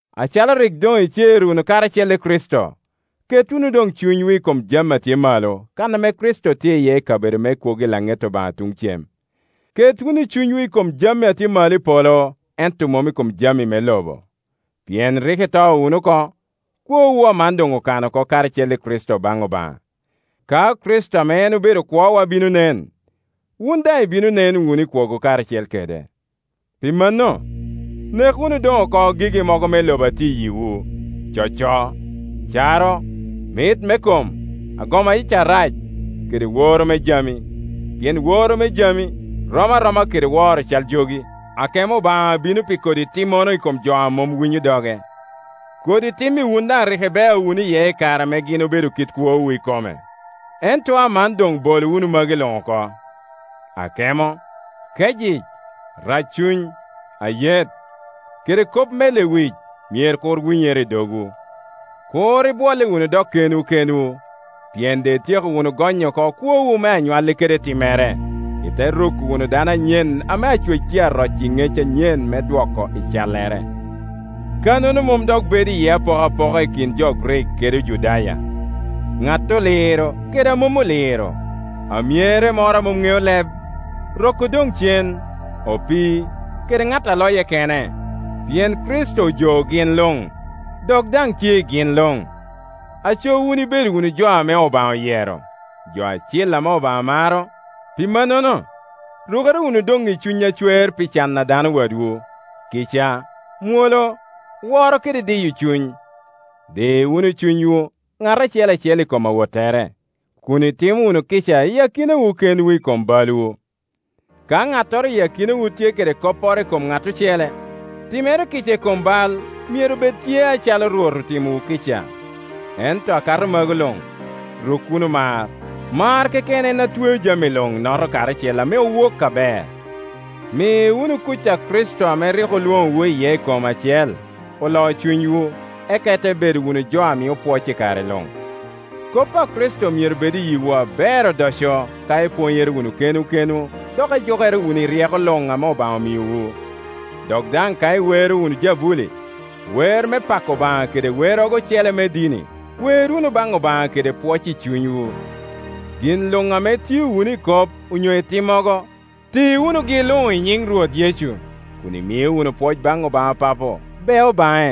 Acalo rik doŋ icer wunu karacel i Kricito, ket wunu doŋ cunywu i kom jami a tye malo, kan ame Kricito tye iye i kabedo me kwogo i laŋet Obaŋa tuŋ cem. Ket wunu cunywu i kom jami a tye malo i polo ento mom i kom jami me lobo. Pien rik ito wunu oko, kwowu aman doŋ okano oko karacel i Kricito baŋ Obaŋa. Ka Kricito ame en obedo kwowa bino nen, wun daŋ ibino nen wunu i kwogo karacel kede. Pi mano, nek wunu doŋ oko gigi mogo me lobo a tye i yiwu: coco, caro, mit me kom, agoma yic arac, kede woro me jami; pien woro me jami rom aroma kede woro cal jogi. Akemo Obaŋa bino pi kodi timmono i kom jo a mom winyo doge. Kodi tim-mi wun daŋ rik ibeo wunu iye i kare a gin obedo kit kwowu ikome. Ento aman doŋ bol wunu magi luŋ oko; akemo, kecyic, raccuny, ayet, kede kop me lewic myero kur winyere i dogwu. Kur ibwolle wunu dok kenwu kenwu, pien doŋ ityeko wunu gonyo oko kwowu me anywalli kede timmere, ite ruko wunu dano anyen ame Acwec tye a roco i ŋec anyen me dwoko i callere. Kannono mom dok bedo iye apokapoka i kin jo Grik kede Ojudaya, ŋat oliro kede a mom oliro, amyere moro a mom ŋeo leb, rok odoŋ cen, opii, kede ŋat a loye kene, pien Kricito ojoo gin luŋ, dok daŋ tye i gin luŋ. Aco wun ibedo wunu jo ame Obaŋa oyero, jo acil ame Obaŋa maro; pi mannono, rukere wunu doŋ i cuny acwer pi can a dano wadwu, kica, mwolo, woro kede diyo cuny. Di wunu cunywu ŋat acel acel i kom awottere, kun itimo wunu kica i akinawu kenwu i kom balwu. Ka ŋattoro i akinawu tye kede kopporo i kom ŋat ocele, timere kica i kom bal myero bed tye acalo Rwot otimowu kica. Ento akato magu luŋ, ruk wunu mar. Mar keken en atweo jami luŋ, noto karacel ame owok aber. Mi wunu kuc a Kricito ame rik olwoŋowu iye i kom acel, olo cunywu, eka ite bedo wunu jo a mio pwoc i kare luŋ. Kop a Kricito myero bed i yiwu aber odoco ka ipwonyere wunu kenwu kenwu dok ijukere wunu i ryeko luŋ ame Obaŋa omiowu. Dok daŋ ka iwero wunu jabuli, wer me pako Obaŋa kede werrogo ocele me dini, wer wunu baŋ Obaŋa kede pwoc i cunywu. Gin luŋ ame itio wunu i kop onyo i timmogo, ti wunugi luŋ i nyiŋ Rwot Yecu, kun imio wunu pwoc baŋ Obaŋa Papo bea baŋe.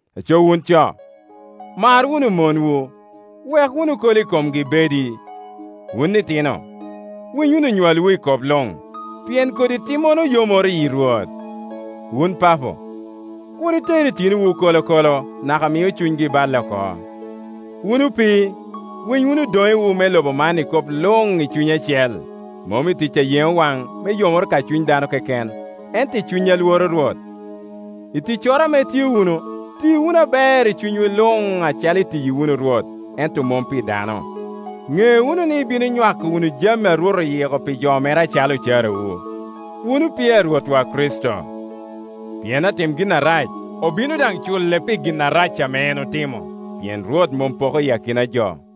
Pet. 3.7Aco wun co, mar wunu monwu, wek wunu kolo i komgi bedi. Wun itino, winy wunu onywalwu i kop luŋ, pien kodi timmono yomoro yi Rwot. Wun papo, kur iter itinowu kolokolo, naka mio cunygi balle oko. Wun opii, winy wunu odoŋewu me loba man i kop luŋ i cuny acel, mom i tic a yeŋo waŋ, me yomoro ka cuny dano keken, ento i cuny a lworo Rwot. I ticcoro ame itio wunu, ti wunu aber i cunywu luŋ acalo itiyi wunu Rwot, ento mom pi dano. Ŋe wunu ni ibino nywako wunu jami ame Rwot oyiko pi jo mere acalo ocarawu. Wun opii a Rwotwa Kricito. Pien atim gin arac, obino daŋ cule pi gin arac ame en otimo, pien Rwot mom poko i akina jo.